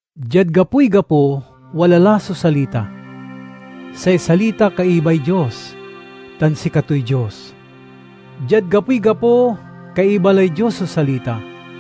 Diad gapoy gapo wala la so Salita. Say Salita kaibay Dios tan sikatoy Dios. Diad gapoy gapo kaiba lay Dios so Salita.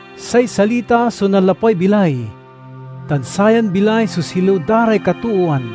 Say Salita so nanlapway bilay, tan sayan bilay so silew da ray katoowan.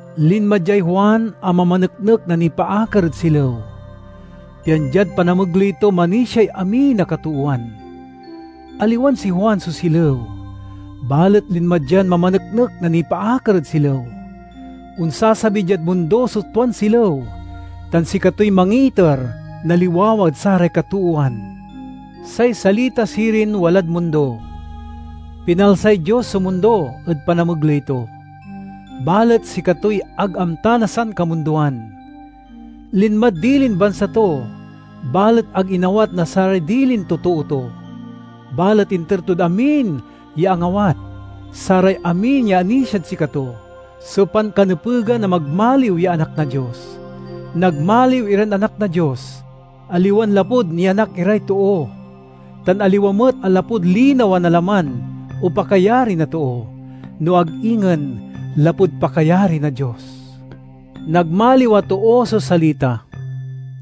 Linma diay Juan a mamaneknek na nipaakar ed silew, pian diad panamegley to manisiay amin a katoowan. Aliwan si Juan so silew, balet linma dian mamaneknek na nipaakar ed silew. Onsasabi diad mundo so tuan silew tan sikatoy mangiiter na liwawa ed saray katoowan. Say Salita sirin walad mundo. Pinalsay Dios so mundo ed panamegley to, balet sikatoy ag amta na sankamundoan. Linmad dilin bansa to, balet ag inawat na saray dilin totoo to. Balet inter tod amin ya angawat, saray amin ya anisiad sikato so pankanepegan a magmaliw ya anak na Dios. Nagmaliw iran anak na Dios, aliwan lapud nianak iray too, tan aliwa met a lapud linawa na laman o pakayari na too, no ag ingen lapud pakayari na Dios. Nagmaliw a too so Salita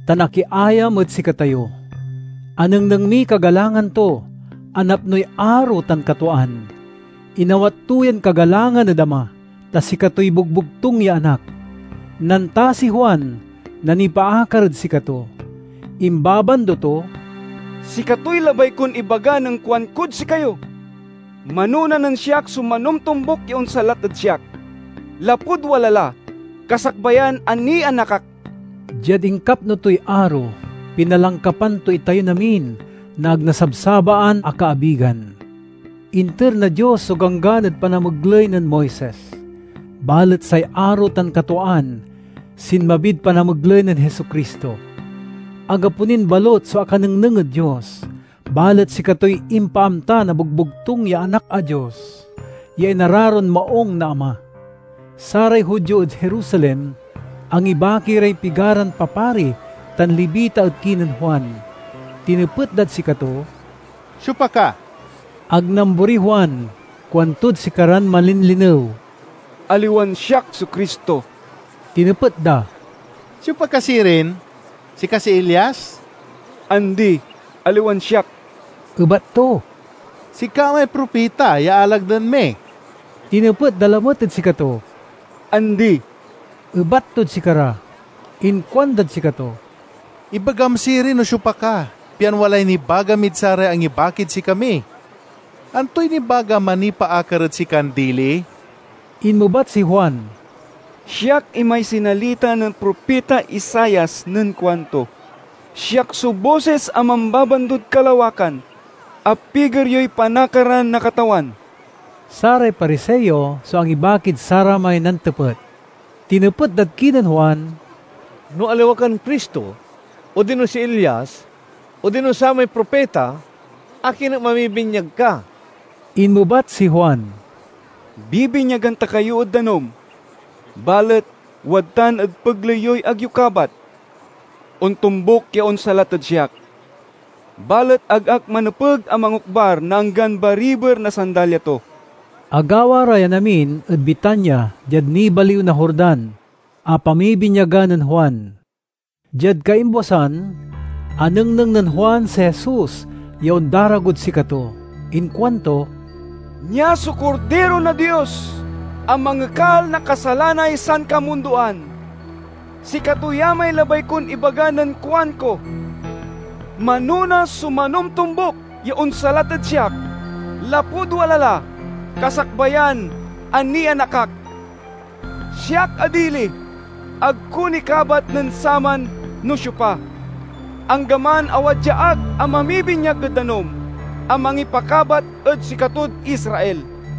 tan akiayam ed sikatayo. Anengneng miy kagalangan to a napnoy aro tan katwaan. Inawat to yan kagalangan ed Ama, ta sikatoy bogbogtung ya Anak. Nantasiy Juan na nipaakar ed sikato. Imbabando to, "Sikatoy labay kon ibaga nen kuankod sikayo, 'Manona nen siak so manomtombuk ya onsalat ed siak, lapud wala la kasakbayan a nianak ak.'" Diad inkapno toy aro, pinalangkapan to itayon amin na ag nasabsabaan a kaabigan. Inter na Dios so Ganggan ed panamegley nen Moises, balet say aro tan katwaan sinmabid panamegley nen Jesu-Cristo. Anggapo nin balut so akanengneng ed Dios, balet sikatoy impaamta na bogbogtung ya Anak a Dios ya inararon maung na Ama. Saray Judio ed Jerusalem angibaki ray pigaran papari tan Levita ed kinen Juan. Tinepet dad sikato, "Siopa ka?" Ag namboriy Juan; kuantod sikaran malinlinew, "Aliwan siak so Cristo." Tinepet da, "Siopa ka sirin? Sika si Elias?" "Andi, aliwan siak," ebat to. "Sika may propita ya alagden mi?" tinepet da lamet ed sikato. "Andi," ebat tod sikara. Inkuandad sikato, "Ibagam sirin no siopa ka, pian walay nibaga mid saray angibakid sikami. Antoy nibagam a nipaakar ed sikan dili?" Inmebat si Juan, "Siak imay sinalita nen propita Isaias nen kuanto, 'Siak so bosis a mambabandod kalawakan. Apiger yoy panakaran na Katawan!'" Saray Pariseo so angibakid saramay nantepet. Tinepet dad kinen Juan, "No aliwa kan Cristo, odino si Elias, odino samay Propita, akin et mamibinyag ka?" Inmebat si Juan, "Bibinyagan ta kayo ed danum, balet wadtan ed pegley yoy ag yo kabat. Ontombuk ya onsalat ed siak, balet ag ak manepeg a mangokbar na anggan bariber na sandalya to." Agawa ra yan amin ed Betania diad nibaliw na Jordan a pamibinyagan nen Juan. Diad kaimbwasan, anengneng nen Juan si Jesus ya ondaragod sikato. Inkuanto, "Nia so Kordiro na Dios a mangekal na kasalanay sankamundoan. Sikato ya may labay kon ibaga nen kuanko, 'Manona so manomtombuk ya onsalat ed siak lapud wala la kasakbayan a nianak ak.' Siak a dili, ag ko ni kabat nen saman no siopa, anggaman a wadya ak a mamibinyag ed danum a mangipakabat ed sikatod Israel."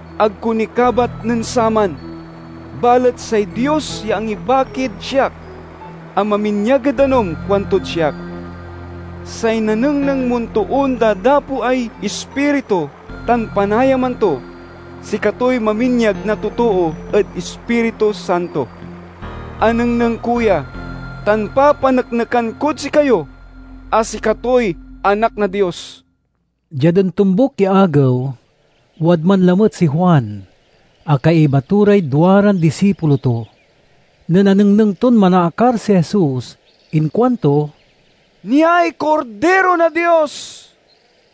Ag ko ni kabat nen saman, balet say Dios ya angibakid siak a maminyag ed danum kuantod siak, 'Say nanengneng mon toon dadapoay Ispiritu tan panayaman to sikatoy maminyag na totoo ed Ispiritu Santo.' Anengneng ko ya tan papaneknekan kod sikayo a sikatoy Anak na Dios." Diad ontombuk ya agew, wadman lamet si Juan a kaiba to ray duaran disipulo to. Nen anengneng ton manaakar si Jesus inkuanto, "Niay Kordiro na Dios!"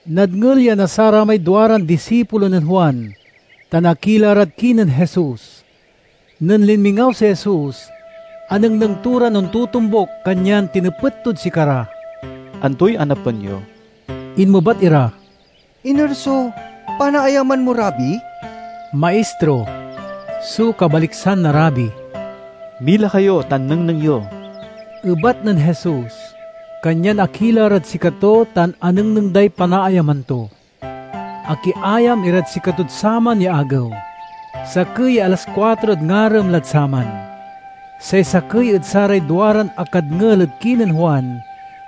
Nadngel ya na saramay duaran disipulo nen Juan tan akila rad kinen Jesus. Nen linmingaw si Jesus, anengneng to ran ontotombuk kanyan tinepet tod sikara, "Antoy anapen yo?" Inmebat ira, "Iner so panaayaman mo, Rabi?" ("Maistro" so kabaliksan na Rabi.) "Mila kayo tan nengneng yo," ebat nen Jesus. Kanyan akila rad sikato tan anengneng day panaayaman to. Akiayam irad sikatod saman ya agew. Sakey ya alas kuatrod ngarem lad saman. Say sakey ed saray duaran akadngel ed kinen Juan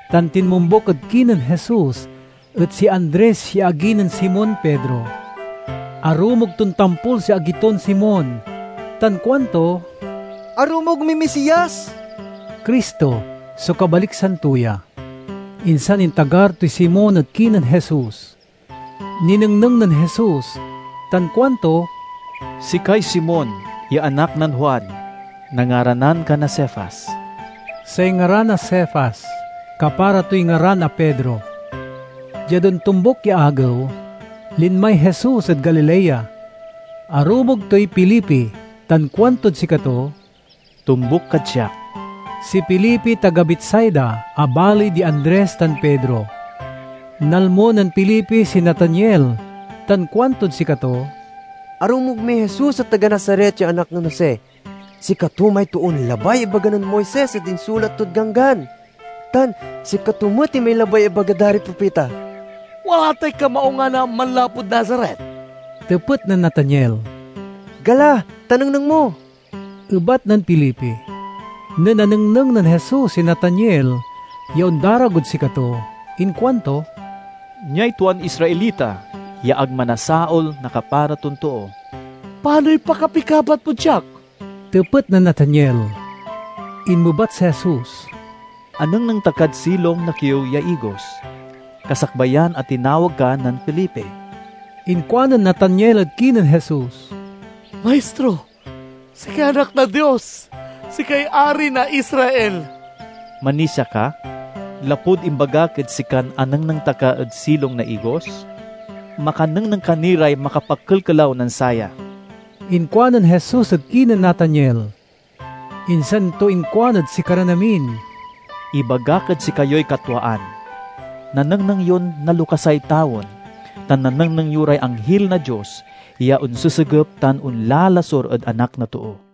tan tinmombuk ed kinen Jesus et si Andres ya agi nen Simon Pedro. Arumog ton tampol si agi ton Simon, tan kuanto, "Arumog miy Misias!" ("Cristo" so kabaliksan to ya.) Insan intagar toy Simon ed kinen Jesus. Ninengneng nen Jesus tan kuanto, "Sikay Simon ya anak nen Juan. Nangaranan ka na Cefas." (Say ngaran a Cefas, kapara toy ngaran a Pedro.) Diad ontombuk ya agew, linmay Jesus ed Galilea. Arumog toy Felipe tan kuantod sikato, "Tombuk kad siak." (Si Felipe taga Betsaida a baley di Andres tan Pedro.) Nalmo nen Felipe si Nataniel tan kuantod sikato, "Arumog miy Jesus a taga Nazaret ya anak nen Jose. Sikato may toon labay ya ibaga nen Moises ed insulat tod Ganggan, tan sikato met imay labay ya ibaga da ray propita." "Wala tay kamaungan a manlapud Nazaret?" tepet nen Nataniel. "Gala, ta nengneng mo," ebat nen Felipe. Nen anengneng nen Jesus si Nataniel ya ondaragod sikato inkuanto, "Niay tuan Israelita ya ag manasaol na kapara ton too." "Panoy pakapikabat mod siak," tepet nen Nataniel. Inmebat si Jesus, "Anengneng ta kad silong na kiew ya igos, kasakbayan a tinawag ka nen Felipe." Inkuanen Nataniel ed kinen Jesus, "Maistro, sikay Anak na Dios! Sikay Ari na Israel!" "Manisia ka, lapud imbagak ed sikan anengneng ta ka ed silong na igos? Makanengneng ka ni ray makapakelkelaw nen saya," inkuanen Jesus ed kinen Nataniel. Insan to inkuan ed sikaran amin, "Ibagak ed sikayoy katwaan, nanengneng yon nalokasay tawen tan nanengneng yo ray anghil na Dios ya onsesegep tan onlalasur ed Anak na Too."